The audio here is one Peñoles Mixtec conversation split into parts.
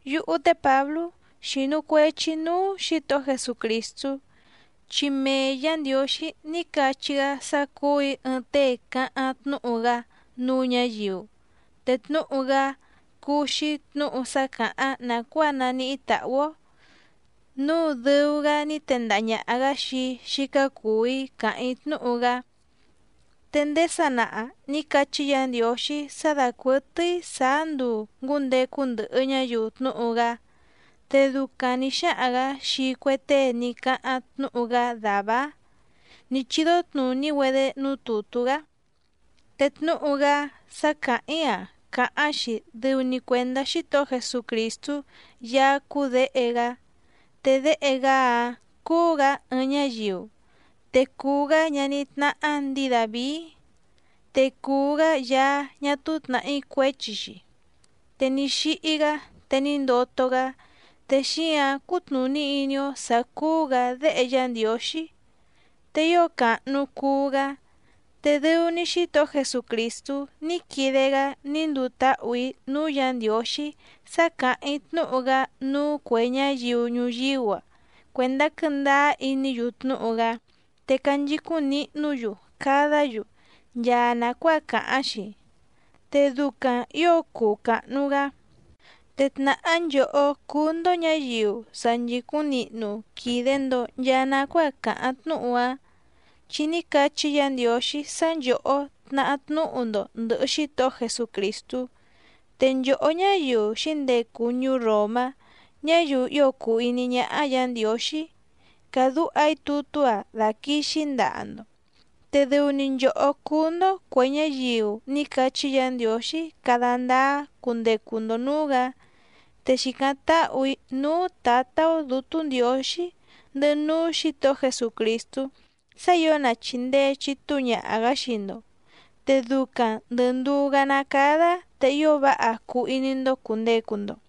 Yúhú té Pǎblú xínú cuèchi‑í núú Xǐtohó Jesucrìstú, chi mee Yǎ Ndiǒxí ní cachí‑gá sá cúù‑í ɨɨⁿ tée cáháⁿ tnúhu‑gá núú ñǎyiu, te tnúhu‑gá cúú‑xí tnǔhu sá càháⁿ nàcuáa naníhí tàhú‑ó, núu dɨu‑gá ní tendaha ñàha‑gá xii‑í xícá cùu‑í càháⁿ‑í tnúhu‑gá. Te ndéé sanaha nǐ cachí Yǎ Ndiǒxí sá dàcuɨtɨ́í sàá nduu ngǔndecu ndɨhɨ ñáyiu tnúhu‑gá. Te ducaⁿ nǐ xáhaⁿ‑gǎ xii cue tée ní cáháⁿ tnúhu‑gá dàvá‑áⁿ nǐ chídó tnùní‑güedé núú tùtú‑gá. Te tnúhu‑gá sá càháⁿ‑í‑a càháⁿ‑xi dɨu‑ni cuèndá Xítohó Jesucrìstú Yaá cúú Děhe‑gá. Te Déhe‑gá‑áⁿ cúú‑gǎ ɨɨⁿ ñáyiu, te cùu‑gá ñaní tnáhá ndǐi Dàvií. Te cùu‑gá Yaá ñá túú tnàhí cuéchi‑xi. Te ní xíhí‑gá te ní ndoto‑gá, te xíǎⁿ cútnùní iní‑ó sǎ cúú‑gǎ Déhe Yá Ndiǒxí, te ío càhnu cuu‑gá. Te dɨu‑ni Xítohó Jesucrìstú ní quide‑gá ní nduu táhù‑í núú Yǎ Ndiǒxí sá càháⁿ‑í tnúhu‑gá núú cuè ñáyiu ñuyíú‑a cuèndá quɨ́ndáá iní‑yu tnúhu‑gá te canchicúⁿ nihnú‑yu cadá‑yu nchaa nàcuáa càháⁿ‑xi, te ducaⁿ ǐo cuu càhnu‑gá. Te tnàhá nchòhó cúú‑ndó ñǎyiu sa nchìcúⁿ nihnu quìde‑ndo nchaa nacuáa càháⁿ tnúhu‑áⁿ, chi ní cachí Yǎ Ndiǒxí sá nchòhó tnahá tnúhu‑ndo ndɨ̀hɨ Xítohó Jesucrìstú. Te nchòhó ñáyiu xǐndecu ñuú Ròmá, ñáyiu ío cùu iní ñáhá Yǎ Ndiǒxí, càdúha‑í tutú‑a daquìxi‑í ndaha‑ndo. Te dɨu‑ni nchòhó cúú‑ndó cuè ñáyiu ní cachí Yǎ Ndiǒxí cada ndáá cundecu‑ndo nǔú‑gǎ. Te xìcáⁿ táhù‑í núú Tǎtá‑ó Dǔtú Ndiǒxí ndɨhɨ núú Xǐtohó Jesucrìstú sá ǐo na chìndee chitúu ñaha‑gǎ xii‑ndo, te ducaⁿ ndɨ̀ nduú‑gá ná càda te ío váha cuu iní‑ndó cùndecu‑ndo.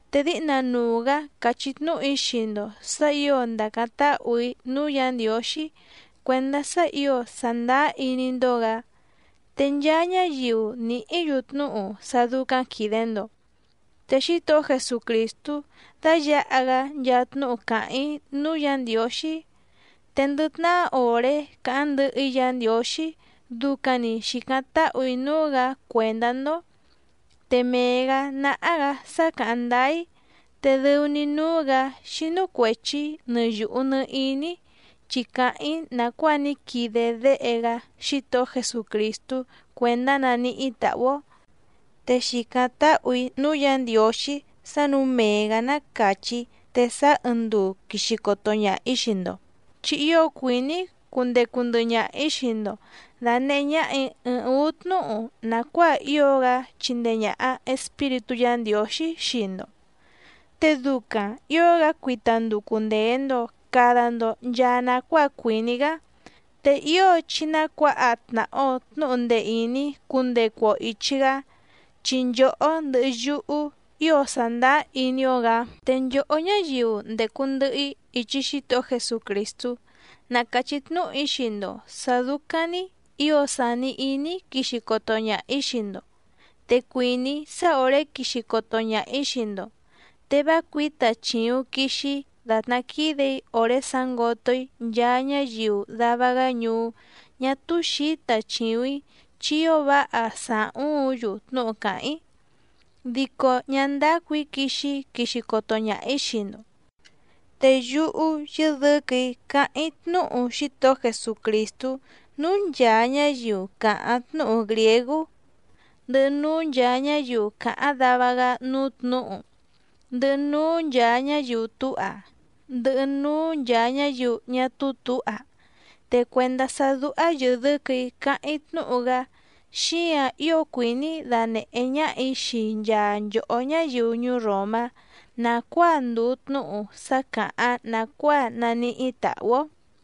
Te díhna nuu‑gǎ càchí tnúhu‑í xii‑ndo sǎ ǐo ndàcáⁿ táhù‑í núú Yǎ Ndiǒxí cuèndá sá ǐo sàndáá iní‑ndó‑gǎ, te nchaa ñáyiu nìhí‑yu tnúhu sá dúcáⁿ quìde‑ndo. Te Xítohó Jesucrìstú dáyǎha‑gá nchaa tnúhu càháⁿ‑í núú Yǎ Ndiǒxí. Te ndɨ tnahá òré càháⁿ ndɨhɨ‑í Yǎ Ndiǒxí ducaⁿ‑ni xìcáⁿ táhù‑í núú‑gǎ cuèndá‑ndó, te mee‑gǎ náhá‑gǎ sá càháⁿ ndáá‑í, te dɨu‑ni núú‑gǎ xínú cuèchi‑í nɨ yùhu nɨ iní‑í, chi càháⁿ‑í nàcuáa ní quide Déhe‑gá Xítohó Jesucrìstú cuèndá naníhí tàhú‑ó. Te xìcáⁿ táhù‑í núú Yǎ Ndiǒxí sá nǔu mee‑gǎ ná càchí te sáá ɨɨⁿ nduu quìxi coto ñaha‑í xii‑ndo. Chi ío cuìní‑í cundecu ndɨhɨ ñaha‑ǐ xii‑ndo dànehé ñáhà‑í ɨɨⁿ ǔú tnúhu nàcuáa ío‑gá chindee ñàha Espíritú Yǎ Ndiǒxí xii‑ndo, te ducaⁿ ǐo‑gá cuita nducu ndèe‑ndo cada‑ndo nchaa nacuáa cuìní‑gá. Te ío chí ná cuǎha tnàha‑o tnúhu ndee ìní cundecu‑o ìchi‑gá, chi nchòhó ndɨhɨ yúhú ío sàndáá iní‑ó‑gǎ. Te nchòhó ñáyiu ndècu ndɨhɨ‑í ichi Xítohó Jesucrìstú na càchí tnúhu‑í xii‑ndo sǎ dúcáⁿ‑ní ǐo sàni iní‑í quixi coto ñaha‑ǐ xii‑ndo. Te cuìní‑í sá òré quixi coto ñaha‑ǐ xii‑ndo, te vá cuǐta chìuⁿ quixi‑í dàtná quídè‑í òré sǎngoto‑í nchaa ñáyiu dava‑gá ñuú ñá túú xǐta chìuⁿ‑í chi ío váha sàhúuⁿ‑yu tnúhu càháⁿ‑í, dico ñá ndácù‑í quixi‑í quixi coto ñaha‑ǐ xii‑ndo. Te yúhú yɨ́dɨ̌quɨ̀‑í cáháⁿ‑í tnúhu Xítohó Jesucrìstú núú nchàa ñáyiu càháⁿ tnúhu grìégú, ndɨhɨ núú nchàa ñáyiu càháⁿ dava‑gá núú tnǔhu, ndɨhɨ núú nchàa ñáyiu túha, ndɨhɨ núú nchàa ñáyiu ñá túú tǔha. Te cuèndá sá dúhá yɨ̀dɨ́quɨ̀‑í cáháⁿ‑í tnúhu‑gá, xíǎⁿ ío cuìní‑í danèhé ñáhà‑í xii nchaa nchòhó ñáyiu ñuú Ròmá nàcuáa ndùu tnúhu sá càháⁿ nàcuáa naníhí tàhú‑ó.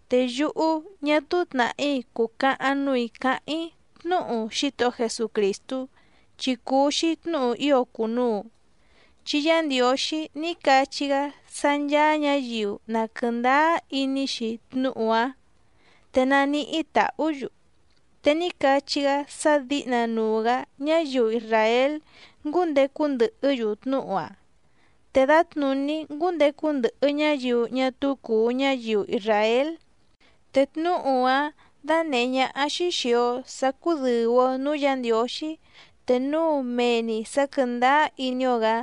Te yúhú ñá túú tnàhí cùcahaⁿ núù‑í cáháⁿ‑í tnúhu Xítohó Jesucrìstú, chi cùu‑xi tnúhu ío cùnuu, chi Yá Ndiǒxí ní cachí‑gá sá ncháá ñǎyiu na quɨ̀ndáá iní‑xi tnúhu‑áⁿ te naníhí tàhú‑yu. Te ní cachí‑gá sá dǐhnanuu‑gǎ ñáyiu isràél ngúndecu ndɨhɨ́‑yu tnúhu‑áⁿ te dǎtnùní ngúndecu ndɨhɨ ñáyiu ñá túú cùu ñáyiu isràél. Te tnúhu‑áⁿ dánèhé ñáhá‑xí xìi‑o sá cúdɨ̀u‑o núú Yǎ Ndiǒxí te núu mee‑ni sǎ quɨ̀ndáá iní‑ó‑gǎ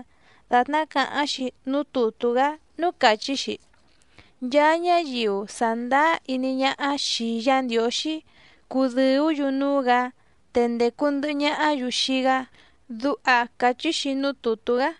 dàtná càháⁿ‑xi núú tùtú‑gá núú càchí‑xi: “Nchaa ñáyiu sàndáá iní ñáhá xìi Yá Ndiǒxí cúdɨ̀ú‑yu núú‑gǎ, te ndècu ndɨhɨ ñahá‑yu xii‑gá”, duha càchí‑xi núú tùtú‑gá.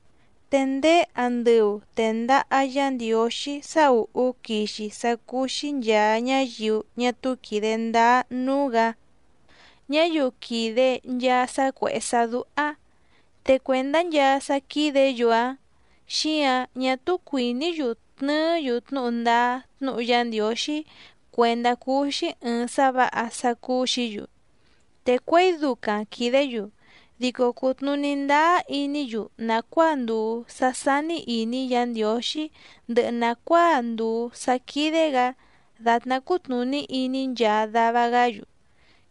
Te ndéé andɨu tèndaha Yá Ndiǒxí sá ùhú quixi sá cúú‑xí nchàa ñáyiu ñá túú quìde ndáá núú‑gǎ, ñáyiu quìde nchaa sá cuèhé sá dúhá. Te cuèndá nchaa sá quídě‑yu‑áⁿ xíǎⁿ ñá túú cuìní‑yu tnɨɨ́‑yu tnúhu ndáá tnúhu Yá Ndiǒxí cuèndá cuu‑xi ɨɨⁿ sá vǎha sá cúú‑xǐ‑yu. Te cuěi ducaⁿ quìdé‑yu dico cùtnuní ndáá iní‑yu nàcuáa ndùu sá sání ìní Yǎ Ndiǒxí ndɨhɨ nàcuáa ndùu sá quídé‑gǎ dàtná cútnùní iní nchaa dava‑gá‑yu,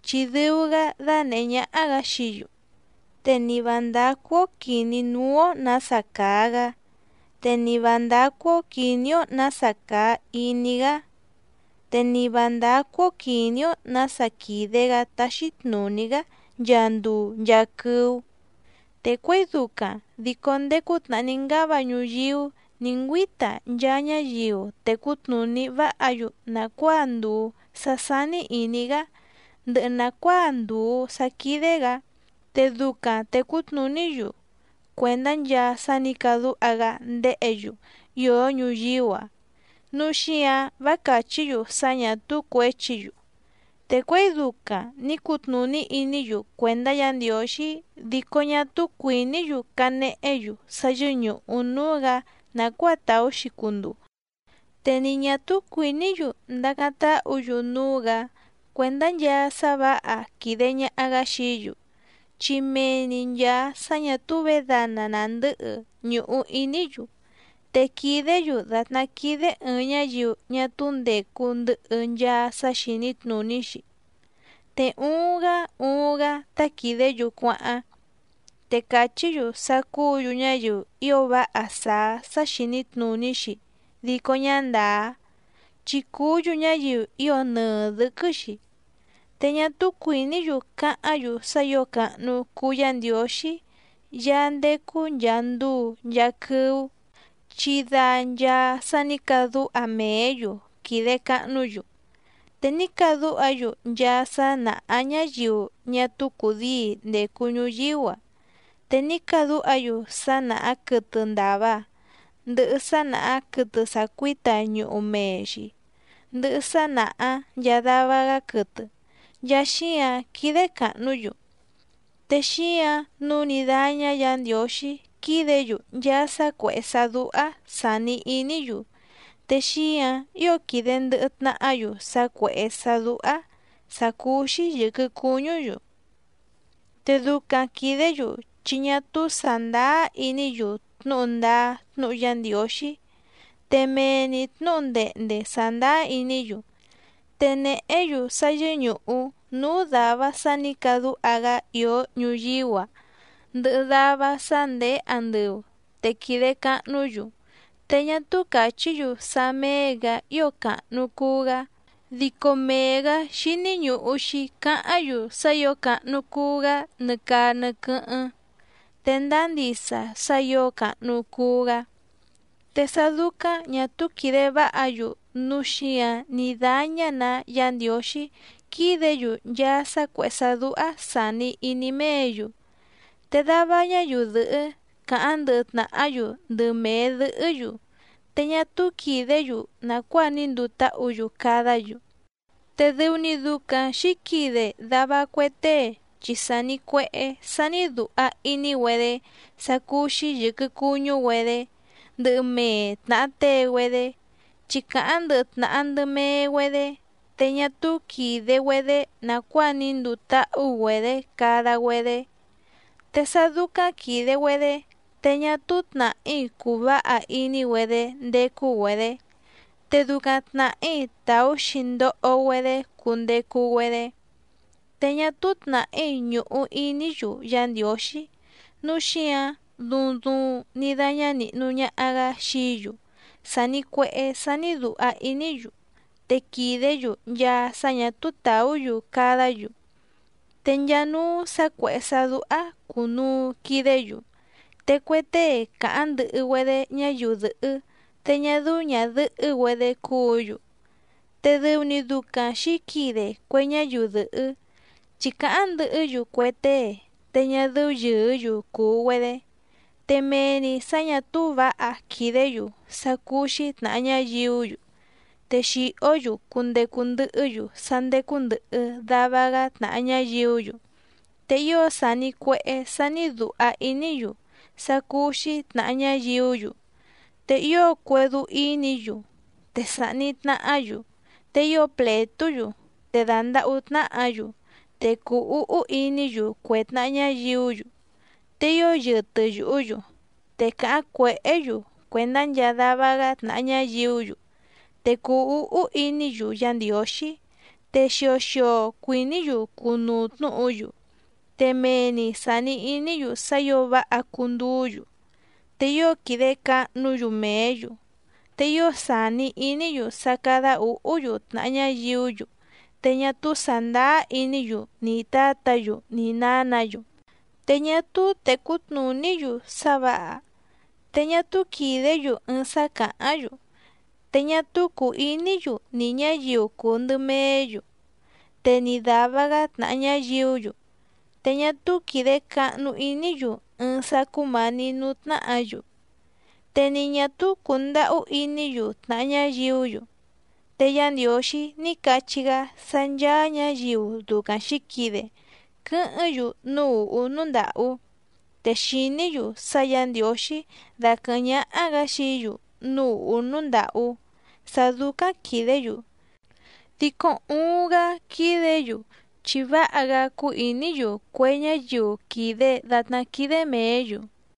chi dɨu‑gá dánèhé ñáhá‑gǎ xií‑yu. Te ni vǎ ndácú‑ó quìní núú‑ó nǎsa càa‑gá, te ni vǎ ndácú‑ó quìní‑ó nǎsa càa iní‑gá, te ni vǎ ndácú‑ó quìní‑ó nǎsa quìde‑gá táxí tnùní‑gá nchaa nduu nchaa quɨ́ú. Te cuěi ducaⁿ dico ndéé cútnàhá ní ngáva ñuyíú nǐ ngüíta nchaa ñáyiu tècú tnùní váha‑yu nàcuáa ndùu sá sání ìní‑gá ndɨhɨ nàcuáa ndùu sá quídé‑gǎ te ducaⁿ tècú tnùní‑yu cuèndá nchaa sá nǐ cadúha‑gá ndéhě‑yu ìó ñuyíú‑a, núu xíǎⁿ vá càchí‑yu sá ñà túú cuěchi‑yu. Te cuěi ducaⁿ nǐ cutnùní iní‑yu cuèndá Yǎ Ndiǒxí dico ñá túú cuìní‑yu canehé‑yu sá yɨ́ñùhu núú‑gǎ nàcuáa tàú‑xi cunduu. Te ni ñà túú cuìní‑yu ndacáⁿ táhǔ‑yu núú‑gǎ cuèndá nchaa sá vǎha quìde ñaha‑gá xií‑yu, chi mee‑ni nchàa sá ñà túú vědana nàndɨ́hɨ ñùhu iní‑yu. Te quìdé‑yu dàtná quídé ɨ̀ɨⁿ ñáyiu ñá túú ndècu ndɨhɨ nchaa sá xìní tnùní‑xi. Te uuⁿ‑gá uuⁿ‑gá tá quìdé‑yu cuáháⁿ. Te càchí‑yu sá cúǔ‑yu ñáyiu ío váha sàá sá xìní tnùní‑xi dico ñá ndàá, chi cùú‑yu ñáyiu ío nɨɨ dɨ̌quɨ́‑xi. Te ñá túú cuìní‑yu cáháⁿ‑yu sá ǐo càhnu cuu Yá Ndiǒxí Yaá ndécú nchàa nduu nchaa quɨ́ú, chi da nchaa sá nǐ cadúha mèé‑yu quìde cahnú‑yu. Te ní cadúha‑yu nchaa sá nàhá ñáyiu ñá túú cùdíi ndècu ñuyíú‑a. Te ní cadúha‑yu sá nàhá quɨtɨ ndàva, ndɨhɨ sá nàhá quɨtɨ sàcuíta ñuhu mee‑xi, ndɨhɨ sá nàhá nchaa dava‑gá quɨtɨ, nchaa xíǎⁿ quídé càhnú‑yu. Te xíǎⁿ nǔu ní dáñá Yǎ Ndiǒxí quídě‑yu nchaa sá cuèhé sá dúhá sàni iní‑yu. Te xíǎⁿ ío quìde ndɨhɨ tnahá‑yu sá cuèhé sá dúhá sàcúú‑xí yɨ̀quɨ cuñú‑yu. Te ducaⁿ quìdé‑yu chi ñá túú sàndáá iní‑yu tnúhu ndáá tnúhu Yá Ndiǒxí. Te mee‑ni tnǔhu ndehnde sàndáá iní‑yu, te nèhé‑yu sá yɨ́ñùhu núú dàva sá nǐ cadúha‑gá ìó ñuyíú‑a ndɨhɨ dava sá ndèé andɨu te quìde cahnú‑yu, te ñá túú càchí‑yu sá méé‑gǎ ío càhnu cuu‑gá, dico mee‑gǎ xíní ñùhu‑xi cáháⁿ‑yu sá ǐo càhnu cuu‑gá nɨ caa nɨ quɨ́hɨ́ⁿ. Te ndáá ndisa sá ǐo càhnu cuu‑gá. Te sá dúcáⁿ ñà túú quìde váha‑yu núu xíǎⁿ ní dáñá‑nǎ Yǎ Ndiǒxí quídě‑yu nchaa sá cuèhé sá dúhá sàni iní méě‑yu. Te dava ñáyiu dɨ̀hɨ́ càháⁿ ndɨhɨ tnàhá‑yu ndɨ mèe dɨhɨ́‑yu te ñá túú quìdé‑yu nàcuáa ní nduu táhǔ‑yu cadá‑yu. Te dɨu‑ni ducaⁿ xǐquide dava cue tée chi sàni cuehé sání dùha iní‑güedé sá cúú‑xí yɨ̀quɨ cuñú‑güedé ndɨ mèe tnaha tée‑güedé, chi càháⁿ ndɨhɨ tnàha ndɨ mee‑güedé te ñá túú quìde‑güedé nàcuáa ní nduu táhú‑güedě cada‑güedé, te sá dúcáⁿ quìde‑güedé te ñá túú tnàhí cùu váha iní‑güedé ndécú‑güedě, te ducaⁿ tnàhí tàú‑xi ndoho‑güedé cundecu‑güedé. Te ñá túú tnàhí ñùhu iní‑yu Yá Ndiǒxí nǔu xíǎⁿ duuⁿ duuⁿ ní dáñá nìhnu ñaha‑gá xií‑yu sàni cuehé sání dùha iní‑yu, te quìdé‑yu nchaa sá ñà túú tàú‑yu cadá‑yu. Te nchaa núú sǎ cuèhé sá dúhá cùnuu quidé‑yu. Te cue tée càháⁿ ndɨhɨ‑güedé ñáyiu dɨ̀hɨ́ te ñá dɨ́ú ñàdɨhɨ́‑güedé cúǔ‑yu. Te dɨu‑ni ducaⁿ xǐquide cue ñáyiu dɨ̀hɨ́ chi càháⁿ ndɨhɨ́‑yu cue tée te ñá dɨ́ú yɨ̀ɨ́‑yu cùu‑güedé. Te mee‑ni sǎ ñà túú vǎha quìdé‑yu sá cúú‑xí tnàha ñáyiú‑yu, te xìhó‑yu cundecu ndɨhɨ́‑yu sá ndécú ndɨ̀hɨ dava‑gá tnàha ñáyiú‑yu, te ío sàni cuehé sání dùha iní‑yu sá cúú‑xí tnàha ñáyiú‑yu, te ío cuédú ínǐ‑yu, te sàhni tnahá‑yu, te ío plètú‑yu, te dàndahú tnáhǎ‑yu, te cùu úhú iní‑yu cue tnàha ñáyiú‑yu, te ío yɨtɨ yùhú‑yu. Te càháⁿ cuèhé‑yu cuèndá nchaa dava‑gá tnàha ñáyiú‑yu, te cùu úhú iní‑yu Yá Ndiǒxí, te xio xio cuìní‑yu cunuu tnúhu‑yu, te mee‑ni sàni iní‑yu sá ǐo váha cunduú‑yu, te ío quìde cahnú‑yu mèé‑yu, te ío sàni iní‑yu sá cádá ǔhú‑yu tnàha ñáyiú‑yu, te ñá túú sàndáá iní‑yu ni tǎtǎ‑yu ni nǎnǎ‑yu. Te ñá túú tècú tnùní‑yu sá vǎha, te ñá túú quìdé‑yu ɨɨⁿ sá càháⁿ‑yu, te ñá túú cùu iní‑yu nì ñáyiu cùu ndɨ meé‑yu, te ni dàva‑gá tnàha ñáyiú‑yu, te ñá túú quìde cahnu iní‑yu ɨɨⁿ sá cúmǎní nǔú tnáhǎ‑yu, te ni ñà túú cùndahú iní‑yu tnàha ñáyiú‑yu. Te Yá Ndiǒxí ní cachí‑gá sá ncháá ñǎyiu ducaⁿ xǐquide quɨ́hɨ́ⁿ‑yu núú ùhú núú ndàhú. Te xìní‑yu sá Yǎ Ndiǒxí daquɨ̀hɨ́ⁿ ñáhá‑gǎ xií‑yu núú ùhú núú ndàhú sá dúcáⁿ quìdé‑yu, dico uuⁿ‑gá quídě‑yu chi váha‑gá cúú ìní‑yu cue ñáyiu quìde datná quídé mèé‑yu.